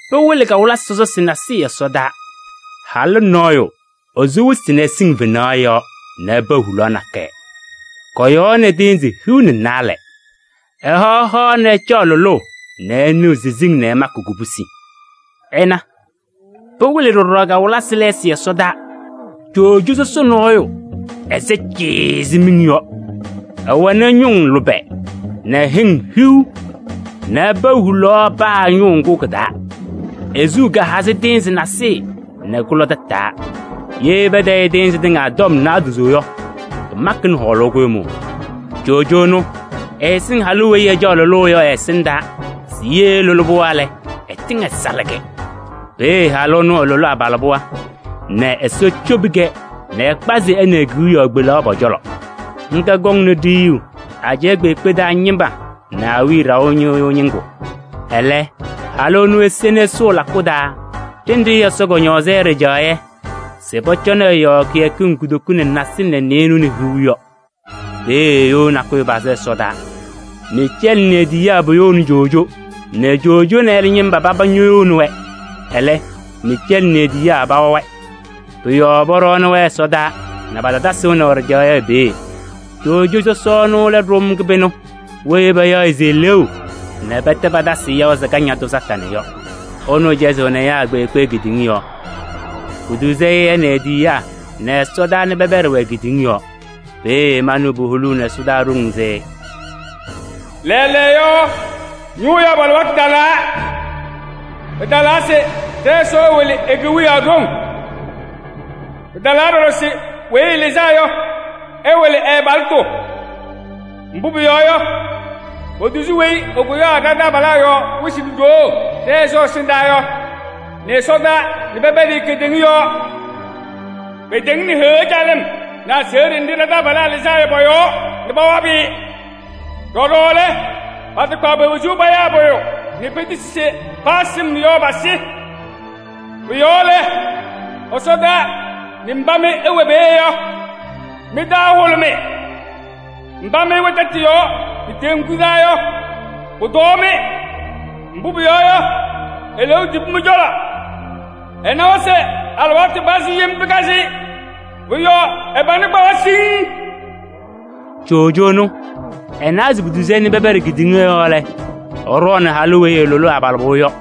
Pɩwɩlɩ kawɩlɩsɩ sɔsɔsɩ nasɩyɩ ɛsɔdaa: halʋ nɔɔyʋ, esu wɩsɩ nɛ ɛsɩŋ fenaɣ yɔɔ nɛ ɛpa hulaɣ nakɛyɛ. Kɔ-yɔɔ nɛ tɩɩnzɩ hiu nɛ naalɛ. Ɛhaɣ hoa nɛ ɛcaɣ lʋlʋʋ nɛ ɛnɩɣ siziŋ nɛ ɛmakɩ kubusi. Ɩna! Pɩwɩlɩ ɖɔɖɔ kawɩlɩsɩ lɛɛsɩ ɛsɔdaa: coojo sɔsɔ nɔɔyʋ, ɛsɛ cɩɩɩ ɛzɩ miŋ yɔ. Ɛwɛnɩ ñʋŋ lʋbɛ nɛ hɩŋ hiu nɛ ɛpa hulaɣ paa ɛ-ñʋʋ ŋgʋ kɩ-taa. E-suu kahazɩ tɩɩnzɩ nasɩyɩ nɛ kʋlɔ tataa. Ye patayɩ tɩɩnzɩ tɩŋa tɔm naadozo yɔ, pɩmakɩnɩ hɔɔlʋʋ kʋɖʋmʋʋ. Coojo ɛnʋ, ɛsɩŋ halʋ weyi ɛcaɣ lʋlʋʋ yɔ ɛ-ɛsɩndaa se ɛlʋlɩ ɛ-pɩɣa lɛ, ɛtɩŋ ɛsalɩ-kɛ. Peeye halʋ ɛnʋ ɛlʋlɩ abalɩbɩɣa nɛ Ɛsɔ cobi-kɛ nɛ ɛkpazɩ ɛ nɛ e-kewiyaɣ kpelaɣ pɔ-cɔlɔ. Ŋga kɔŋnɩ ɖiyuu ajɛɛ kpeekpe taa ñɩma nɛ awiya ɖaʋ ñɩɣyʋʋ ñɩŋgʋ. Ɛlɛ halʋ ɛnʋ ese nɛ ɛsʋʋ lakʋ taa ɖenɖe Ɛsɔ kɔñɔɔzɩ-ɩ ɖɩjaɣyɛ se pɔcɔnɩ ɛ-yɔɔ kɩyakɩŋ kutoku nɛ nasɩlɛ nɛ nɩɩnʋwa nɛ hiu yɔ. Peeye you nakʋyʋ pazɩ ɛsɔdaa. Miicɛɛlɩ nɛ e-tiyiyaa poyouni coojo nɛ coojo nɛ ɛlɛ ñɩma paba ñoyouni-wɛ. Ɛlɛ, Miicɛɛlɩ nɛ e-tiyiyaa pawabɩ-wɛ. Pʋ-yɔɔ pɔɖɔnɩ-wɛ ɛsɔdaa nɛ patatasɩ wɛnaʋ ɖɩjaɣyɛ peeye. Coojo sɔsɔ ɛnʋ lɛ ɖʋm kɩbɩnʋ weyi payaɣ se Eleeu nɛ pɛtɛ patasɩ-ɩ se Kañadʋ Satanɩ yɔ. Ɛnʋ cɛzɩɣnɩ ɛyaa kpeekpe kedeŋa yɔɔ. Potuzi ɛ nɛ e-tiyiyaa nɛ ɛsɔdaa nɛ pɛpɛɖɩ-wɛ kedeŋa yɔɔ. Peeye manɩɣ puholuuni ɛsɔdaa ɖoŋ se: “Lɛɛlɛɛyɔ, ñʋʋ yabʋ alɩwaatʋ talaa! Pɩtalaa se ɖɛ-Ɛsɔ ɛwɩlɩ e-Kewiyaɣ ɖoŋ! Pɩtalaa ɖɔɖɔ se Weyi Ɛlɩzaa Yɔ, ɛwɩlɩ ɛ-abalɩtʋ. Mbʋ pʋyɔɔ yɔ, potuzi weyi ɛkʋyaɣ ɖa-taabalaa yɔɔ wɩsɩ nɛ ɖoo ɖɛ-Ɛsɔ ɛsɩndaa yɔ nɛ ɛsɔdaa nɛ pɛpɛɖɩ-ɩ kedeŋa yɔɔ. Pɩtɩŋnɩ Heɣa calɩm nɛ aseɣɖe nɖɩ ɖa-taabalaa lɩzaa yɔ pɔ-yɔɔ nɛ pawabɩ-ɩ. Ɖɔɖɔ lɛ, patakpaɣ pe-wezuu payaa pʋyʋ nɛ petisi se ye paa sɩm yɔ, pasɩ. Pʋ-yɔɔ lɛ, ɛsɔdaa nɛ mba mɩ ɩwɛ peeye yɔ, mɩ-taa ɛhʋlʋmɩ! Mba mɩ ɩwɛ tɛtʋ yɔɔ nɛ teŋgu taa yɔ, pʋtɔɔ-mɩ! Mbʋ pʋyɔɔ yɔ, eleeu tibi mɩ-cɔlɔ. Ɛnawa se alɩwaatʋ pazɩ yem pɩkazɩ-ɩ, pʋ-yɔɔ ɛ-pana kpawa pɩŋŋ.” Coojo ɛnʋ, ɛnawa se potuzi-i nɛ pɛpɛɖɩ kedeŋa yɔɔ lɛ, ɛɖɔɔnʋʋ halʋ weyi ɛlʋlɩ abalɩbɩɣa yɔ.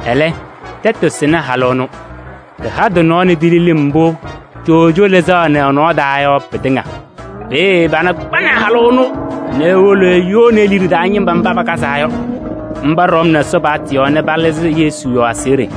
Ɛlɛ, tɛtʋ sɩnɩ halʋ ɛnʋ: tɩha tɩ-nɔɔ nɛ tili lɩm mbʋ coojo lɩzaɣnɩ ɛ-nɔɔ taa yɔ, pɩtɩŋa. Peeye ɛ-pana kpanɩ halʋ ɛnʋ nɛ ewolo eyouni e-liɖe taa ñɩma mba pakazaa yɔ. Mba ɖɔmnɩ Ɛsɔ paɣtʋ yɔɔ nɛ palɩzɩ Yesu yɔɔ aseɣɖe.